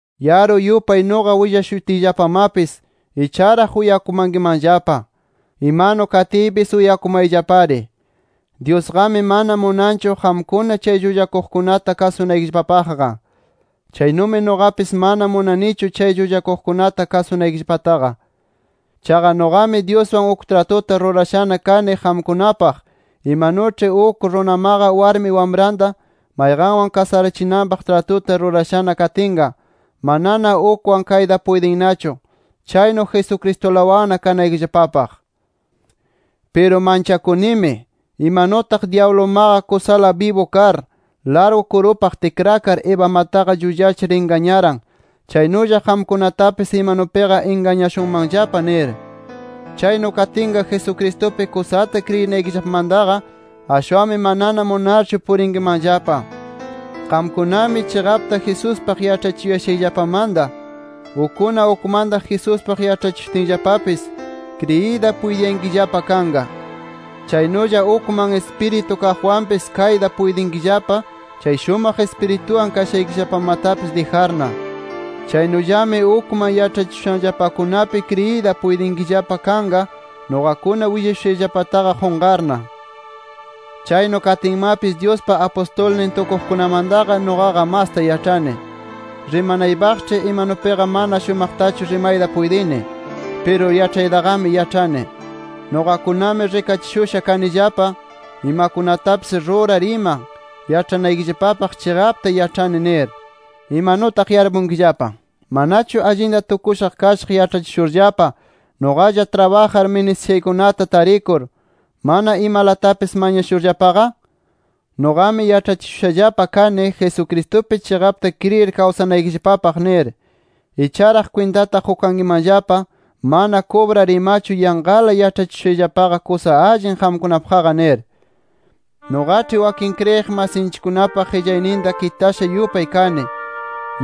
Yaru yupay nuqa willashutiyllapamapis, icharaq uyakumankimanllapa. Imanu katiypis uyakumayllapari. Dyusqami mana munanchu qamkuna chay llullakuqkunata kasunaykillapapaqqa. Chaynumi nuqapis mana munanichu chay llullakuqkunata kasunaykillapataqa. Chaqa nuqami, Dyuswan uk tratuta rurashana kani qamkunapaq, imanuĉhi uk runamaqa warmi wamranta mayqanwan kasarachinanpaq tratuta rurashana katinqa, manana ukwan kayta puytinnachu, chaynu Jesucristulawanna kanaykillapapaq. Piru manchakunimi, imanutaq dyablumaqa kusala bibu kar largu kurupaq tikrakar, Evamataqa llullachir ingañaran, chaynulla qamkunatapis imanupiqa ingañashunmanllapa nir. Chaynu katinqa, Jesucristupi kusata kriyinaykillapamantaqa, ashwanmi manana munarnachu purinkimanllapa. Qamkunami, chiqapta Jesuspaq yaĉhachishushayllapamanta, ukkuna ukmanta Jesuspaq yaĉhachishutinllapapis, kriyiyta puytiyankillapa kanqa. Chaynulla ukman ispiritu kaqwanpis kayta puytinkillapa chay shumaq Ispirituwan kashaykillapamatapis dijarna. Chaynullami ukman yaĉhachishushanllapakunapi kriyiyta puytinkillapa kanqa nuqakuna willashushayllapataqa qunqarna. Chaynu katinmapis Dyuspa apustulnin tukuqkunamantaqa nuqaqa masta yaĉhani. Rimanaypaqĉhi imanupiqa mana shumaqtachu rimayta puytini. Piru yaĉhaytaqami yaĉhani. Nuqakunami rikachishusha kanillapa imakunatapis rurar ima, yaĉhanaykillapapaq chiqapta yaĉhani nir. Imanutaq yarpunkillapa. ¿Manachu allinta tukusha kashaq yaĉhachishurllapa, nuqalla trabajar ministishaykunata tarikur, mana imalatapis mañakushurllapaqa? Nuqami yaĉhachishushallapa kani, Jesucristupi chiqapta kriyir kawsanaykillapapaq nir. Icharaq kwintata qukankimanllapa mana kubrar imachu yanqala yaĉhachishushayllapaqa kusa allin qamkunapaqqa nir. Nuqaĉhi wakin kriyiq masinchikkunapa qillayninta kitasha yupay kani,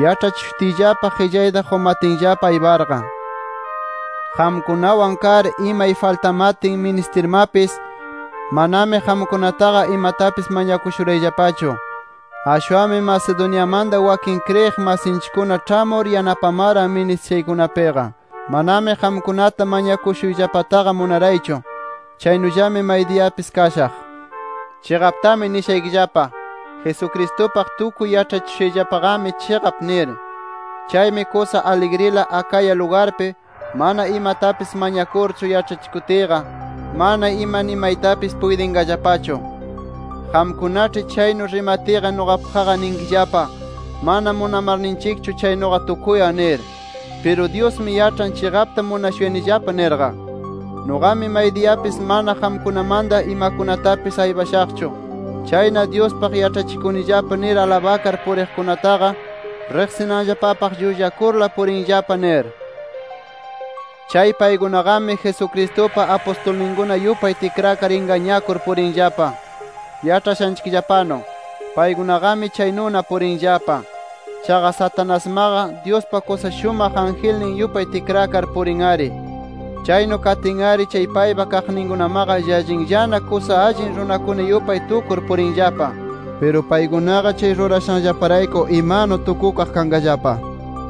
yaĉhachishutiyllapa qillayta qumatinllapa ayparqa. Qamkunawan kar imay faltamatin ministirmapis, manami qamkunataqa imatapis mañakushurayllapachu. Ashwanmi Macedoniamanta wakin kriyiq masinchikkuna ĉhamur yanapamaran ministishaykunapiqa. Manami qamkunata mañakushuyllapataqa munaraychu. Chaynullami maydiyapis kashaq. Chiqaptami nishaykillapa: Jesucristupaq tukuy yaĉhachishushayllapaqami, chiqap nir. Chaymi kusa aligrila Acaya lugarpi, mana imatapis mañakurchu yaĉhachikutiyqa, mana imanimaytapis puytinqallapachu. Qamkunaĉhi chaynu rimatiyqa nuqapaqqa ninkillapa: Mana munamarninchikchu chaynuqa tukuyan nir. ¡Piru Dyusmi yaĉhan chiqapta munashuyanillapa nirqa! Nuqaqami maydiyapis mana qamkunamanta imakunatapis aypashaqchu. Chayna, Dyuspaq yaĉhachikunillapa nir alabakar puriqkunataqa riqsinanllapapaq, llullakurla purinllapa nir. Chay paykunaqami, Jesucristupa apustulninkuna yupay tikrakar ingañakur purinllapa. Yaĉhashanchikllapanu, paykunaqami chaynuna purinllapa. Chaqa Satanasmaqa, Dyuspa kusa shumaq angelnin yupay tikrakar purin-ari. Chaynu katin-ari, chay paypa kaqninkunamaqa llallinllana kusa allin runakuna yupay tukur purinllapa. Piru paykunaqa chay rurashanllaparayku, ¡imanu tukukaq kanqallapa!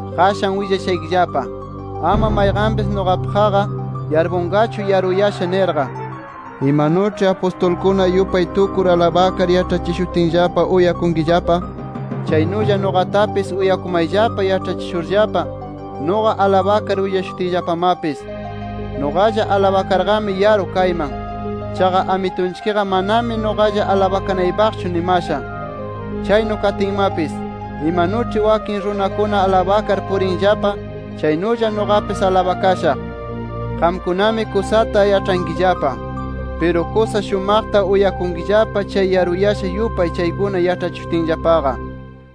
Qashan willashaykillapa, ama mayqanpis nuqapaqqa yarpunqachu yaruyasha nirqa. Imanuĉhi apustulkuna yupay tukur alabakar yaĉhachishutinllapa uyakunkillapa, chaynulla nuqatapis uyakumayllapa yaĉhachishurllapa nuqa alabakar willashutiyllapamapis. Nuqalla alabakarqami yaru kayman. Chaqa Amitunchikqa manami nuqalla alabakanaypaqchu nimasha. Chaynu katinmapis, imanuĉhi wakin runakuna alabakar purinllapa, chaynulla nuqapis alabakashaq. Qamkunami kusata yaĉhankillapa. Piru, kusa shumaqta uyakunkillapa chay yaruyasha yupay chaykuna yaĉhachishutinllapaqa.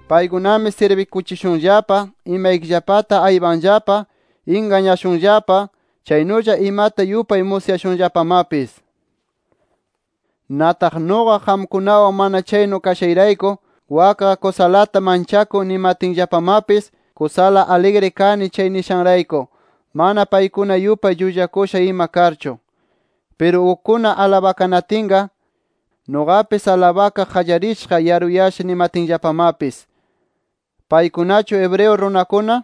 Paykunami sirbikuchishunllapa, imaykillapata aypanllapa, ingañashunllapa, chaynulla imata yupay musyashunllapamapis. Nataq nuqa, qamkunawan mana chaynu kashayrayku, “Wakqa kusalata manchakun” nimatinllapamapis, kusala aligri kani chay nishayrayku, mana paykuna yupay llullakusha ima karchu. Piru ukkuna alabakanatinqa, nuqapis alabakaq qallarishaq, yaruyasha nimatkillapamapis. ¿Paykunachu hebreo runakuna?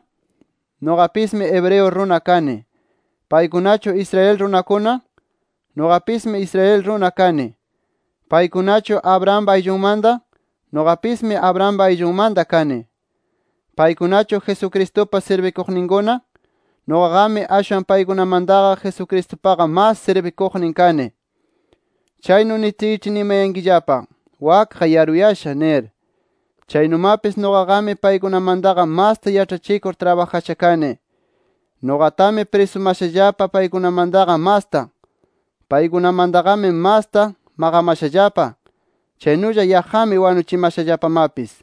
Nuqapismi hebreo runa kani. ¿Paykunachu Israel runakuna? Nuqapismi Israel runa kani. ¿Paykunachu Abrahampa ayllunmanta? Nuqapismi Abrampa ayllunmanta kani. ¿Paykunachu Jesucristupa sirbikuqninkuna? Nuqaqami ashwan paykunamantaqa Jesucristupaqa mas sirbikuqnin kani. Kaynu nitiyĉhi nimankillapa, “Wakqa yaruyasha” nir. Chaynumapis, nuqaqami paykunamantaqa masta yaĉhachikur trabajasha kani. Nuqatami prisumashallapa paykunamantaqa masta. Paykunamantaqami masta maqamashallapa. Chaynulla yaqqami wanuchimashallapamapis.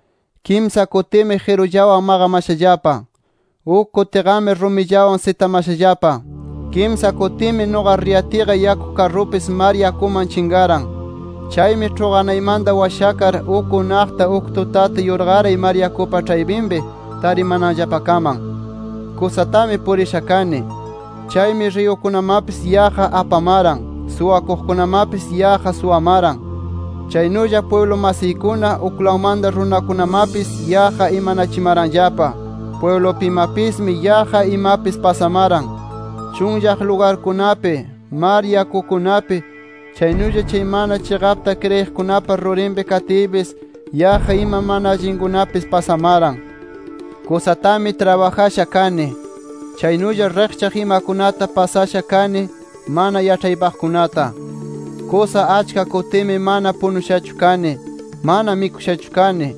Kimsa kutimi qirullawan maqamashallapa. Uk kutiqami rumillawan sitamashallapa. Kimsa kutimi nuqa riyatiyqa yaku karrupis mar yakuman chinqaran. Chaymi ĉhuqanaymanta washakar, uk unaqta uk tutata yurqaray mar yakupa ĉhaypinpi, tarimananllapakaman. Kusatami purisha kani. Chaymi riyukunamapis yaqqa apamaran, suwakuqkunamapis yaqqa suwamaran. Chaynulla pwiblu masiykuna, uklawmanta runakunamapis yaqqa imanachimaranllapa. Pwiblupimapismi yaqqa imapis pasamaran. Chunllaq lugarkunapi, mar yakukunapi, chaynulla chay mana chiqapta kriyiqkunapa rurinpi katiypis, yaqqa ima mana allinkunapis pasamaran. Kusatami trabajasha kani. Chaynulla riqchaq imakunata pasasha kani mana yaĉhaypaqkunata. Kusa achka kutimi mana punushachu kani, mana mikushachu kani,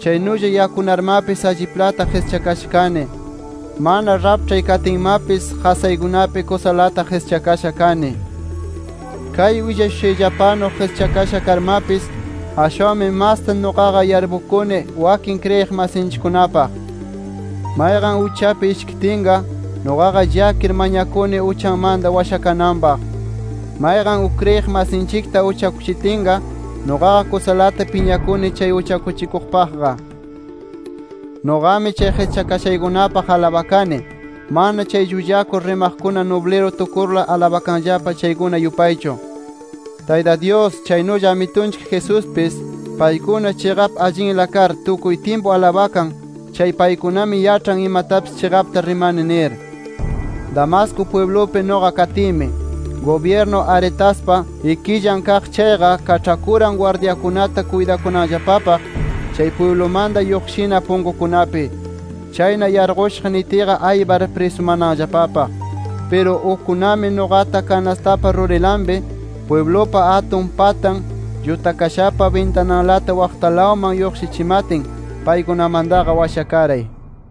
chaynulla yakunarmapis alliplata qischakasha kani. Mana raĉhpay katinmapis, qasaykunapi kusalata qischakasha kani. Kay willashushayllapanu qischakasha karmapis, ashwanmi masta nuqaqa yarpukuni wakin kriyiq masinchikkunapaq. Mayqan uchapi ishkitinqa, nuqaqa llakir mañakuni uchanmanta washakananpaq. Mayqan uk kriyiq masinchikta uchakuchitinqa, nuqaqa kusalata piñakuni, chay uchakuchikuqpaqqa. Nuqami chay qischakashaykunapaq alabakani, mana chay llullakur rimaqkuna nubliru tukurla alabakanllapa chaykuna yupaychu. Tayta Dyus, chaynulla Amitunchik Jesuspis, paykuna chiqap allinla kar tukuy tyimpu alabakan chay paykunami yaĉhan imatapis chiqapta rimani nir. Damasco pwiblupi nuqa katiymi, gubyirnu Aretaspa ikillan kaq chayqa, kaĉhakuran gwardyakuna kuytakunanllapapaq chay pwiblumanta lluqshina punkukunapi. Chayna yarqushaq nitiyqa aypar prisumananllapapaq. Piru, ukkunami nuqata kanastapa rurinlapi, pwiblupa atun patan llutakashanpa bintanalata waqtalawman yarquchimatin, paykunamantaqa washakaray.